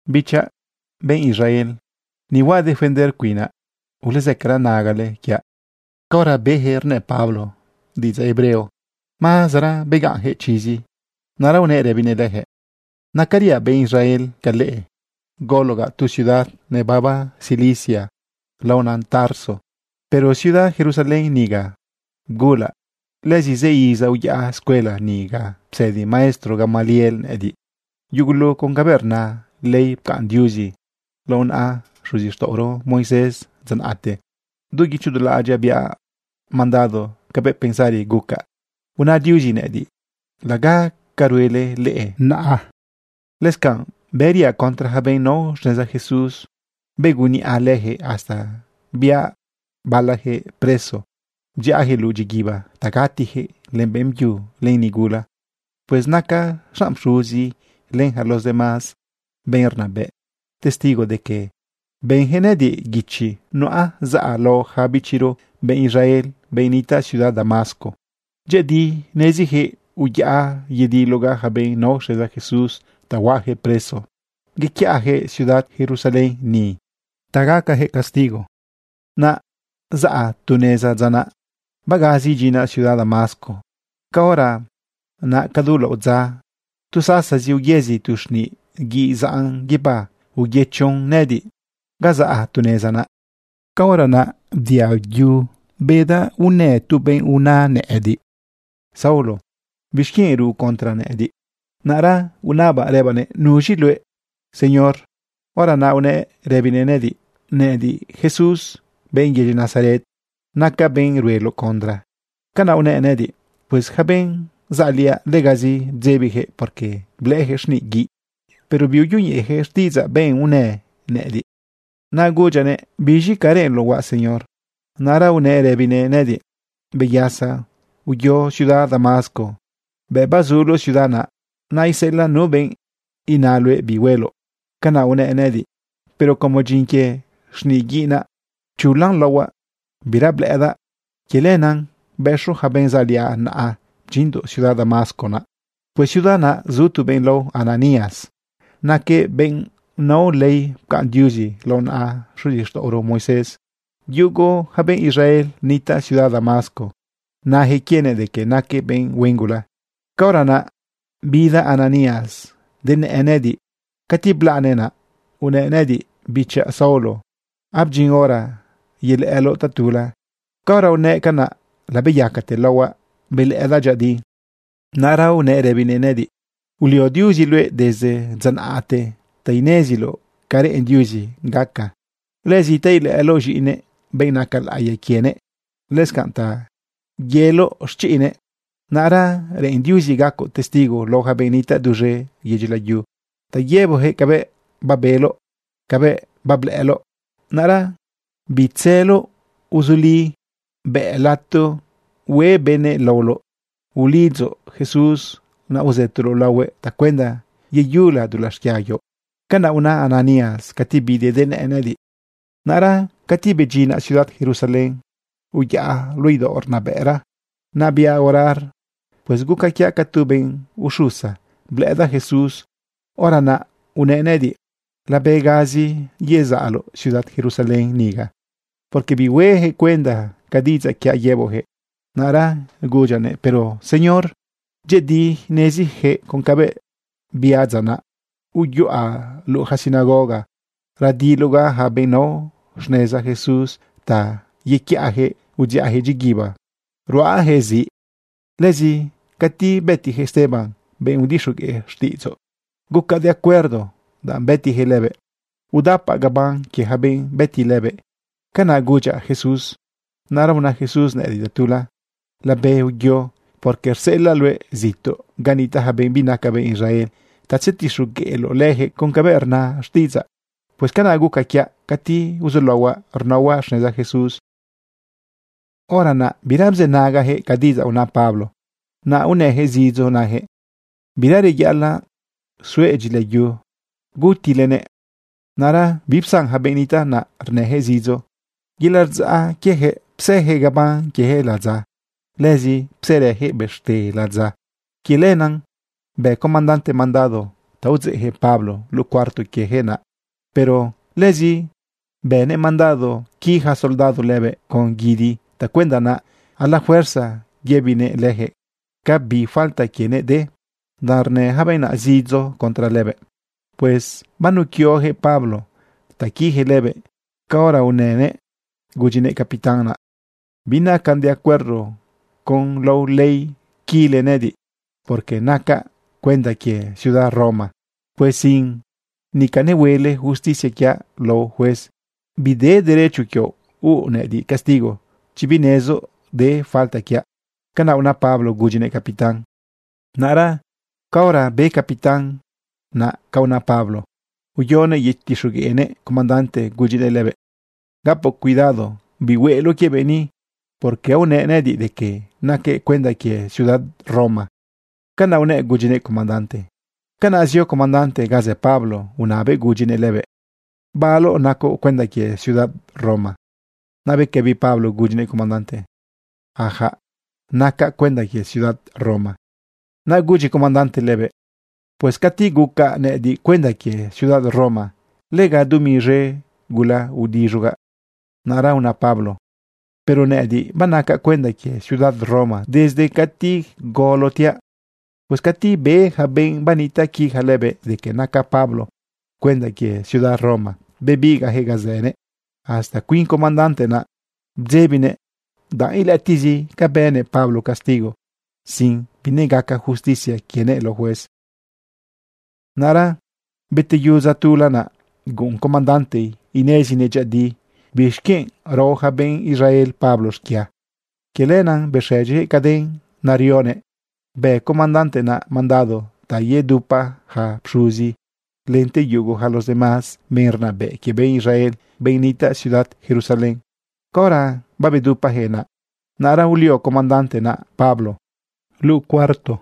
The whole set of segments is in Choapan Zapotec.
―Bichaꞌ benꞌ Israel, ni huaꞌ defender cuinaꞌ. Ulezëcara nagale quiaꞌ. Caora beyaquëꞌ rnë Pablo diꞌidzaꞌ hebreo, mazera begaꞌnjëꞌ chizi. Naꞌra unëꞌ rëbinëꞌ leyaquëꞌ: ―Nacariaꞌ benꞌ Israel ca leꞌe. Gologaꞌ tu ciudad nebaba Cilicia laona Tarso. Pero ciudad Jerusalén niga bgulaꞌ. Lëzi zë iza uyaꞌa escuela ni ga psëdi maestro Gamaliel nëꞌëdiꞌ yugulu con cabëꞌ rna ley pcaꞌn Diuzi lao naꞌa xuzixtaꞌoro Moisés dza naꞌte. Du guicho du laꞌadyaꞌ biaꞌ mandado cabëꞌ pensari gucaꞌ una Diuzi nëꞌëdiꞌ, laga ca ruele leꞌe naꞌa. Lëscanꞌ bëriaꞌ contra yaca benꞌ nao xneza Jesús. Begunniꞌa leyaquëꞌ hasta biaꞌ balajëꞌ preso bdziꞌayaquëꞌ luꞌu dyiguiba ta gatijëꞌ, len beꞌmbyu, len nigula. Pues naca xanꞌ pxuzi len yaca los demás benꞌ rnabëꞌ testigo de que benyaquëꞌ nëꞌëdiꞌ guichi nuꞌa zaꞌa lao ja bichiro benꞌ Israel, benꞌ nitaꞌ ciudad Damasco. Dyëꞌëdi neziyaquëꞌ uyaꞌa yedilogaꞌ yaca benꞌ nao xneza Jesús ta huaꞌayaquëꞌ preso yequiꞌayaquëꞌ ciudad Jerusalén ni ta gacajëꞌ castigo. ’Naꞌ zaꞌ tu neza dza naꞌ, bagazi idyinaꞌ ciudad Damasco, caora naꞌ cadu laꞌodza tu sasazi uyëzi tu xniꞌ guiꞌ zaꞌn guibá uyëchon nëꞌëdiꞌ ga zaꞌ tu neza naꞌ. Caora naꞌ bdiaꞌ yu bedaꞌ unë tu benꞌ una nëꞌëdiꞌ: “Saulo, ¿bixquienꞌ ruꞌ contra nëꞌëdiꞌ?” Naꞌra unabaꞌ rëbaꞌnëꞌ: “¿Nuz̃i luëꞌ, Señor?” Hora naꞌ unëꞌ rëbinëꞌ nëꞌëdiꞌ: “Nëꞌëdiꞌ Jesús, benꞌ yedyi Nazaret. Nacaꞌ benꞌ rueloꞌ contra.” Canaꞌ unëꞌ nëꞌëdiꞌ. Pues yaca benꞌ zaꞌliaꞌ, legazi bdzebiyaquëꞌ, porque blëꞌëyaquëꞌ xniꞌ guiꞌ, pero biuyoñeꞌeyaquëꞌ xtiꞌidzaꞌ benꞌ unë nëꞌëdiꞌ. Naꞌ agudyaꞌnëꞌ: “¿Biz̃i ca reꞌenloꞌ huaꞌ, Señor?” Naꞌra unëꞌ rëbinëꞌ nëꞌëdiꞌ: “Beyasa, uyo ciudad Damasco. Bëꞌ bazuloꞌ ciudad naꞌ, naiseꞌelaꞌ nu benꞌ ina luëꞌ bi hueloꞌ.” Canaꞌ unëꞌ nëꞌëdiꞌ. Pero como dyin quie xniꞌ guiꞌ naꞌ, pchulan laohuaꞌ, bira blëꞌëdaꞌ. Quie lenaꞌ bëxo yaca benꞌ zaꞌliaꞌ naꞌa bdyinndoꞌ ciudad Damasco naꞌ. ’Pues ciudad naꞌ zu tu benꞌ lao Ananías. Naquëꞌ benꞌ nao ley pcaꞌn Diuzi lao naꞌa xuzixtaꞌoro Moisés. Yugu yaca benꞌ Israel nitaꞌ ciudad Damasco nayaquëꞌ quienëꞌ de que naquëꞌ benꞌ huen gula. Caora naꞌ bida Ananías denëꞌë nëꞌëdiꞌ. Cati blaꞌnëꞌ naꞌ, unëꞌ nëꞌëdiꞌ: “Bichaꞌ Saulo, abdyin hora yelëꞌëloꞌ tatula.” Caora unëꞌ canaꞌ labeyacate laohuaꞌ. Belëꞌëdaꞌ dyëꞌëdi. Naꞌra unëꞌ rëbinëꞌ nëꞌëdiꞌ: “Ulio Diuzi luëꞌ desde dza naꞌte ta ineziloꞌ ca reꞌen Diuzi gaca, lëzi ta ilëꞌëloꞌ z̃iꞌinëꞌ, benꞌ naca laꞌiya quienëꞌ, lëscanꞌ ta yeloꞌ xchiꞌnëꞌ. Naꞌra reꞌen Diuzi gacoꞌ testigo lao yaca benꞌ nitaꞌ duz̃e yedyi layu, ta yëboꞌyaquëꞌ cabëꞌ babeloꞌ, cabëꞌ bablëꞌëloꞌ. Naꞌra, bitzëloꞌ. Uzuli, bëꞌ lato hueꞌ benëꞌ laoloꞌ. Ulidzoꞌ Jesús naꞌ uzëtoloꞌ laohuëꞌ tacuenda yeyula dulaꞌ xquia quioꞌ.” Canaꞌ una Ananías cati bidëꞌ denëꞌë nëꞌëdiꞌ. ’Naꞌra cati bedyinaꞌ ciudad Jerusalén, uyaꞌa luꞌu idaoꞌ rnabëꞌra naꞌ, biaꞌ orar. Pues guca quiaꞌ ca tu benꞌ uxusa, blëꞌëdaꞌ Jesús. Hora naꞌ unëꞌ nëꞌëdiꞌ: “Labegazi yezaꞌloꞌ ciudad Jerusalén niga, porque bihuejëꞌ cuenda ca diꞌidzaꞌ quiaꞌ yëboꞌjëꞌ.” Naꞌra gudyaꞌnëꞌ: “Pero señor, dyëꞌëdi nezijëꞌ con cabëꞌ biaꞌ dza naꞌ, uyuꞌa luꞌu yaca sinagoga radilogaꞌ yaca benꞌ nao xneza Jesús ta yequiꞌayaquëꞌ udziꞌajëꞌ dyiguiba ruꞌayaquëꞌ ziꞌ. Lëzi cati bëtiyaquëꞌ Esteban, benꞌ udixogueꞌ xtiꞌidzoꞌ, gucaꞌ de acuerdo danꞌ bëtiyaquëꞌ lëbëꞌ. Udapaꞌ gaban quie yaca benꞌ bëti lëbëꞌ.” Canaꞌ gudyaꞌ Jesús. Naꞌra una Jesús nëꞌëdiꞌ tatula: “Labe uyo, porque rseꞌelaꞌ luëꞌ zituꞌ ga nitaꞌ ja benꞌ binaca benꞌ Israel ta tzetixogueꞌloꞌ leyaquëꞌ con cabëꞌ rna xtiꞌidzaꞌ.” Pues canaꞌ guca quiaꞌ cati uzulaohuaꞌ rnaohuaꞌ xneza Jesús. Hora naꞌ bira bzënagajëꞌ ca diꞌidzaꞌ una Pablo, naꞌ unëyaquëꞌ zidzo nayaquëꞌ: ―¡Bira reyaꞌalaꞌ suëꞌ dyilayu! ¡Gutilenëꞌ! Naꞌra bipsan ja benꞌ nitaꞌ naꞌ rnëyaquëꞌ zidzo. Yelaꞌ rdzaꞌ quiejëꞌ bzeyaquëꞌ gaban quiejëꞌ ladza. Lëzi bzerëyaquëꞌ bëxte ladza. Quie lenaꞌ bë comandante mandado ta udzeꞌyaquëꞌ Pablo luꞌu cuarto quiejëꞌ naꞌ. Pero lëzi bënëꞌ mandado qui yaca soldado lëbëꞌ con guidi tacuenda naꞌ a la fuerza yëbinëꞌ leyaquëꞌ ca bi falta quienëꞌ de, danꞌ rnë yaca benꞌ naꞌ zidzo contra lëbëꞌ. Pues banuquioyaquëꞌ Pablo ta quiyaquëꞌ lëbëꞌ caora unënëꞌ gudyinëꞌ capitán naꞌ: ―Binacan de acuerdo con lao ley quile nëꞌëdiꞌ, porque nacaꞌ cuenda quie ciudad Roma. Pues sin nica nehueloꞌ justicia quiaꞌ lao juez, bide derecho quioꞌ huuꞌ nëꞌëdiꞌ castigo chi binezoꞌ de falta quiaꞌ. ―Canaꞌ una Pablo gudyinëꞌ capitán. Naꞌra caora be capitán naꞌ ca una Pablo, uyonëꞌ yetixogueꞌnëꞌ comandante gudyinëꞌ lëbëꞌ: ―Gapoꞌ cuidado bi hueloꞌ quie benꞌ ni, porque aonëꞌ nëꞌëdiꞌ de que naquëꞌ cuenda quie ciudad Roma. ―Canaꞌ unëꞌ gudyinëꞌ comandante. Canaꞌ zio comandante ga zë Pablo unabëꞌ gudyinëꞌ lëbëꞌ: ―¿Baloꞌ nacoꞌ cuenda quie ciudad Roma? Naꞌ bequëbi Pablo gudyinëꞌ comandante: ―Ajaꞌ, nacaꞌ cuenda quie ciudad Roma. Naꞌ gudyi comandante lëbëꞌ: ―Pues cati gucaꞌ nëꞌëdiꞌ cuenda quie ciudad Roma, lega dumi z̃e gula udiz̃ugaꞌ. Naꞌra una Pablo: ―Pero nëꞌëdiꞌ banacaꞌ cuenda quie ciudad Roma desde cati golotiaꞌ. Pues cati be yaca benꞌ banitaꞌja quija lëbëꞌ de que naca Pablo cuenda quie ciudad Roma, bebigaꞌjëꞌ ga zënëꞌ. Hasta cuin comandante naꞌ bdzebinëꞌ danꞌ ilëꞌëtiꞌzi ca bënëꞌ Pablo castigo sin binegaca justicia quienëꞌ lao juez. Naꞌra beteyu dza tula naꞌ, guꞌun comandante inezinëꞌ dyëꞌëdi bixquienꞌ rao yaca benꞌ Israel Pablo xquia. Quie lenaꞌ bexëdyijëꞌ caden naꞌ nerionëꞌ, bë comandante naꞌ mandado ta yedupa yaca pxuzi lente yugu yaca los demás benꞌ rnabëꞌ quie benꞌ Israel, benꞌ nitaꞌ ciudad Jerusalén. Caora babedupayaquëꞌ naꞌ, naꞌra ulio comandante naꞌ Pablo luꞌu cuarto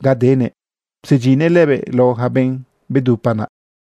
ga denëꞌ psedyinnëꞌ lëbëꞌ lao yaca benꞌ babedupa naꞌ.